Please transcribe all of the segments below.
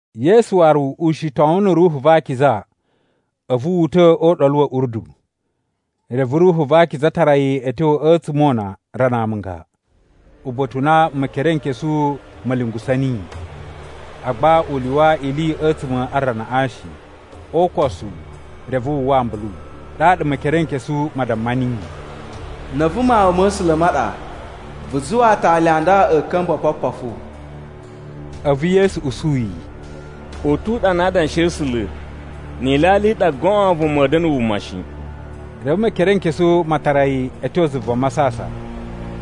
Yesu waru ushitowun na̱ Ruhu va Akiza, a̱vu wu uta̱ o Uɗolu wa̱ Urdu. Reve Ruhu va Akiza tara yi a̱ tyo a̱tsuma̱ o una rana amunga, uba̱ta̱ u na Mekerenkesu ma̱ lyungusa̱ niyi. Agba u lyuwa ili a̱tsuma̱ a ranaꞌa shi, o ukosu reve wu uwwa ambulu. Ɗaɗa Mekerenkesu ma damma niyi, “Na̱ a̱vu Mawun ma̱ A̱sula̱ ma ɗa, vu zuwa aatali a nda a̱ ka̱mba̱ opopofu.” A̱vu Yesu usu yi, “U tu uɗanu a Adanshi a̱ A̱sula̱, ‘Ni ilyalya i ɗa goon vuma a̱a̱ da̱na̱ wuma shi.’” Reve Mekerenkesu ma tara yi a̱ tyo zuva masasan,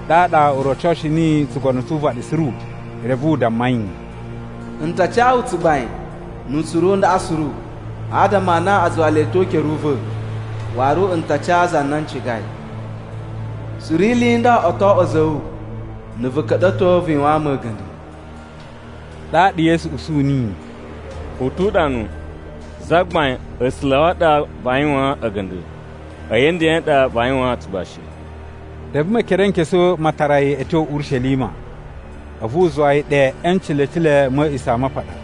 ɗaɗa u rocoshi niyi tsugono tsu uvaɗi suru. Reve u damma yi, “N ta ca wu tsugbain nu utsuru u ndaꞌa suru, adama a na a zuwa le ta̱ o ukere u va̱. Waru n ta ca za na n cigai. Suru ili i nda o to oꞌwo a̱za̱ a̱ wu, na̱ vu ka̱ɗa̱to vu yuwaan mu a̱ga̱nda̱.” Ɗaɗa Yesu usuyi niyi, “U tu uɗanu, ‘Zagbain A̱sula̱ a̱ wu a ɗa vaa yuwaan a̱ga̱nda̱, a̱yi a̱ ndeꞌen ɗa vaa yuwaan tsugbashi.’” Reve Mekerenkesu ma tara yi a̱ tyo Urishelima, a̱vu u zuwa yi ɗe e ncilecile ma̱ A̱a̱ꞌisamapaɗa.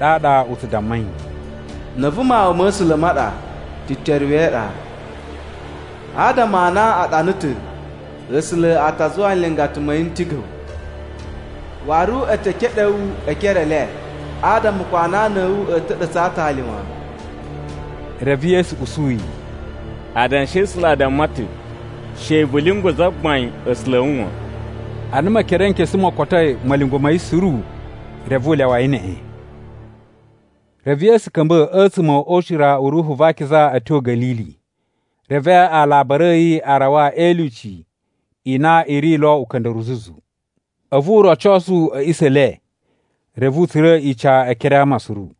Ɗaɗa u tsu damma yi, “Na̱ a̱vu Mawun ma̱ A̱sula̱ ma ɗa, teteruwe e iɗa. Adama a na a ɗana ta̱, ‘A̱sula̱ a ta zuwa nlingata ma̱ yi n tiga̱ wu. Waru e te keɗe wu e ekere e le, adama ko anana a̱ wu a̱ ta̱ɗa̱tsa̱ a aatali wan.’” Reve Yesu usu yi, “Adanshi a̱ A̱sula̱ a damma ta̱, ‘She vu lyungwa̱ Zagbain A̱sula̱ a̱ wu wan.’” Ana Mekerenkesu mo kotoi ma̱lyungwa̱ ma̱ yi suru, reve u lyawa yi neꞌen. Reve Yesu ka̱mba̱ a̱tsuma̱ o ucira u Ruhu va Akiza a̱ tyo Ga̱lili. Reve alabari a̱ yi a rawa e ilyuci i na i ri lo uka̱nda̱ruwu zuzu. A̱vu u rocosu a̱ a̱ꞌisa̱ e le, reve u tsura̱ ica e ekere a ama suru.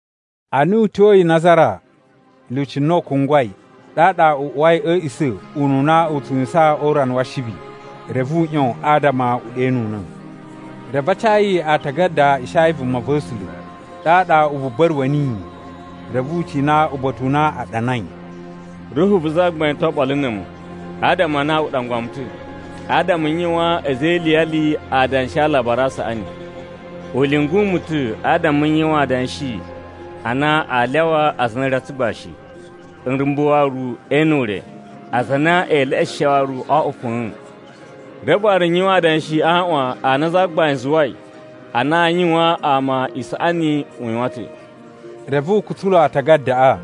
Ana u tyoyi Nazara (lyuci na u kungwai), ɗaɗa u uwai a̱ a̱a̱ꞌisa̱ ununa u tsu yuwusan o urana wa Ashibi. Reve u ꞌyon adama u ɗenuna̱. Reve a ca yi Aatagada a Ishaya vumava̱sula̱. Ɗaɗa u buba̱ruwa̱ niyi, reve u cina uba̱ta̱ u na a ɗanai, “Ruhu vu Zagbain to oɓolo na̱ a̱mu, adama a na u ɗangwa mu ta̱, adama n yuwaan a̱za̱ e iliyali adanshi a Alabari a Saꞌani. U lyungu mu ta̱ adama n yuwan adanshi a na aa lyawa aza a na a̱ ri a tsugbashi, nrumba̱ waru ee ene ure, aza a na ee leꞌeshe waru o oꞌwo fa̱a̱n. Reve waru n yuwan adanshi a aaꞌwan a na Zagbain zuwai a na aa yuwaan ama isaꞌani u yuwan ta̱.” Reve u kutsulu aatagadaꞌa,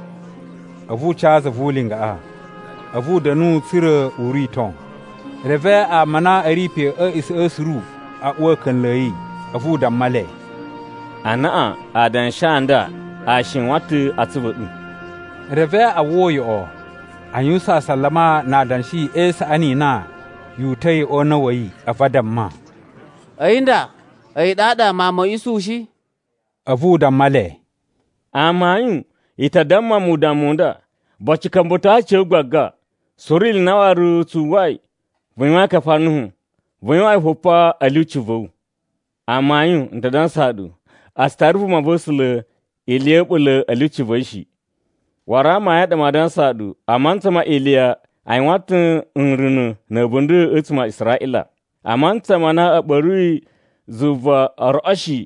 a̱vu u ca za vu ulingaꞌa. A̱vu u da̱nu, tsa̱ra̱ u rito. Reve ama a na a̱ ri pe a̱ a̱a̱ꞌisa̱ꞌa̱ suru a uwa a̱ka̱nla̱ a̱ yi. A̱vu u damma le, “Anaꞌan adanshi a nda a shiwan ta̱ a atsuvu a̱ ɗu.” Reve a uwwa uyoꞌo, a yuwusan asalama na adanshi e isaꞌani i na yu uta̱i o una̱ wa̱ yi. A̱vu a damma, “A̱yi nda, a̱yi ɗaɗa mawun ma̱ Isuhu shi?” A̱vu u damma le, “Amayun, i ta damma mu udammu u nda, ‘Boci, ka̱mba̱to aciya̱wu gbaga.’ ‘Suru ili i na waru tsu uwwai vu yuwain a Kafarnahum, vu yuwan yi fo pa a̱ lyuci va̱ wu.’ Amayun, n ta dansaa ɗu, a tsu tara vumava̱sula̱ ili ya̱ a̱ɓula̱ a̱ lyuci va̱ yi shi. “Waru amayun a ɗa maa dansaa ɗu, a mantsa ma Iliya a yuwan ta̱ nruna̱ ma̱ a̱bunda̱ a̱tsuma̱ a Israꞌila. A mantsa ma na a̱ ɓa̱ruyi zuva o roꞌo shi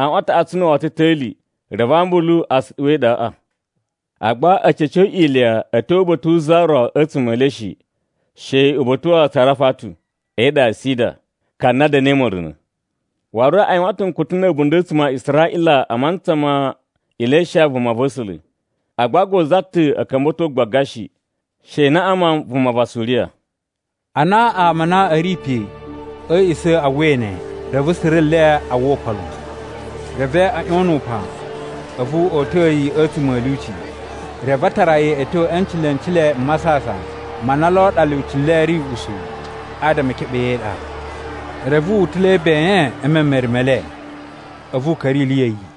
aꞌwan a taꞌatsu na̱ woto ta̱li, reve ambulu a suɗuwa e iɗaꞌa. Agba a̱ ca̱co Iliya a̱ tyo uba̱ta̱ wu za ro a̱tsuma̱ e le shi, she uba̱ta̱ wa Sarafatu, e iɗa ya Sida, ka na da̱na̱i ma̱runa̱. Waru a yuwan ta̱ nkutu na̱ a̱bunda̱ a̱tsuma̱ a Israꞌila a mantsa ma Ilisha vumava̱sula̱. Agba ko za ta̱ a̱ ka̱mba̱to gbaga shi, she Naꞌaman vuma va Suriya.” Ana ama a na a̱ ri pe a̱ a̱a̱ꞌisa̱ a uwwai ne, reve suru nle a uwwa upan lon. Reve a̱ ꞌyon nu upan, a̱vu o uta̱a̱ yi a̱tsuma̱ a̱ lyuci. Reve a tara yi a̱ tyo e ncilecile m masasan ma na lo ɗa lyuci le ri usuwu, adama e keɓe yi e iɗa. Reve wu utula̱i ben e memere me le, a̱vu u ka̱ra̱ ili ya̱ yi.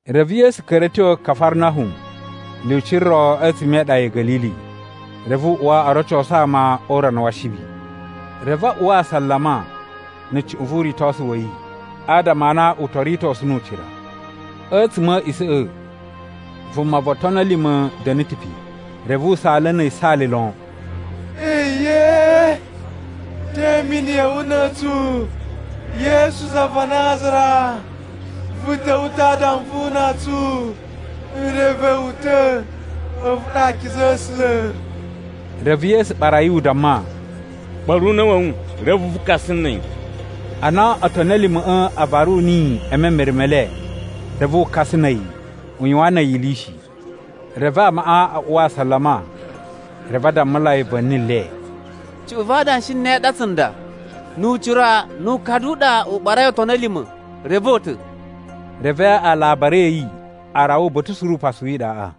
Reve Yesu ka̱ra̱ a̱ tyo Kafarnahum lyuci ro a̱tsuma̱ e iɗa ya̱ Ga̱lili. Reve u uwa o rocosu ama o urana wa Ashibi. Reve a uwa asalama na̱ cuꞌun vu uritosu wa̱ yi, adama a na u to ritosu nu ucira. A̱tsuma̱ a̱ a̱a̱ꞌisa̱ꞌa̱, vuma vo otoni a̱ lima̱ da̱na̱ ta̱ pe, reve u saala na̱ yisaali lon, “Eyee! Te imini ya̱ wu na̱ a̱tsu, Yesu za va Nazara? Vu ta̱wa̱ ta̱ adama vu una tsu? N reve wu ta̱, a̱vu ɗa Akiza a̱ A̱sula̱.” Reve Yesu ɓara yi, u damma, “Ɓa̱ru una̱ wa̱ wu, reve vu kakasa na̱ a̱yi!” Ana otoni a̱ lima̱ꞌa̱ a varu niyi e memere me le, reve wu kasa na̱ a̱yi, u yuwan na̱ a̱yi ili shi. Reve amaꞌa a uwa asalama, reve a dammulai va̱ni le, “Cuꞌun va adanshi e ne a ɗa tsunda? Nu ucira nu ukadu u ɗa u ɓarai otoni a̱ lima̱, reve o uta̱.” Reve alabari a̱ yi a rawa uba̱ta̱ suru upasu wi iɗaꞌa.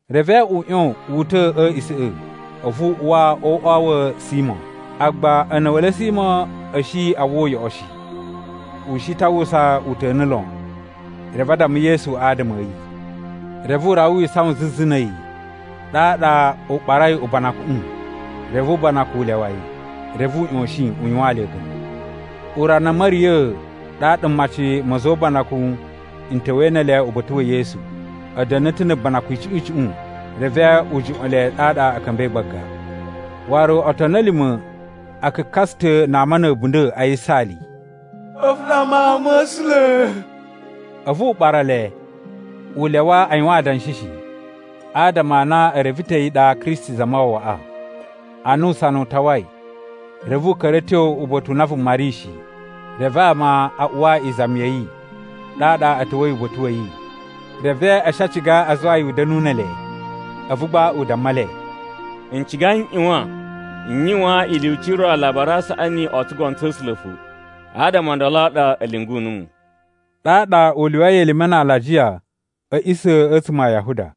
Reve u ꞌyon wu uta̱ a̱ a̱a̱ꞌisa̱ꞌa̱, a̱vu u uwa o uꞌwa wa̱ Simo. Agba a̱na̱wa̱le Simo a̱ shi a uwwa uyoꞌo shi, u shi ta̱ a uwwusa uta̱nu lon. Reve a damma Yesu adama a̱ yi. Reve u rawa wi isawan zuzu na̱ a̱yi, ɗaɗa u ɓarai ubanakuꞌun, reve ubanakun u lyawa yi. Reve u ꞌyoshin u yuwaan le a̱ga̱nda̱. Urana a̱ ma̱riya̱a̱, ɗaɗa mmaci ma̱ a̱za̱ o ubanakun n ta̱wa̱i ne ele uba̱ta̱ wa̱ Yesu. A̱ da̱na̱ ta̱ na̱ banakun icuꞌun icuꞌun. Reve wu juꞌwa̱n le, ɗaɗa a̱ ka̱mba̱i gbagba. Waru otoni a̱ lima̱ a kakasa ta̱ na ama na̱ a̱bunda̱ a yisaali, “A̱vu ɗa Mawun ma̱ A̱sula̱!” A̱vu u ɓara le, u lyawa a yuwan adanshi shi, adama a na e reve ta̱ a̱yi ɗa Kristi Zamawawaꞌa. Ana usana u tawai, reve u ka̱ra̱ a̱ tyo uba̱ta̱ u na vuma ri shi. Reve ama a uwa izami ya̱ yi, ɗaɗa a̱ ta̱wa̱i uba̱ta̱ wa̱ yi. Reve a̱ shi a ciga a zuwa yi u da̱nu ne ele. A̱vu gba u damma le, “N ciga n ꞌyuwan n yuwaan ilyuci i ro alajiya a Alabari a Saꞌani o tsugono tsa̱ A̱sula̱ fo. Adama o ndolo a ɗa a̱ lyungu numu.” Ɗaɗa u lyuwai elime na alajiya a̱ a̱ꞌisa̱ a̱tsuma̱ a Yahuda.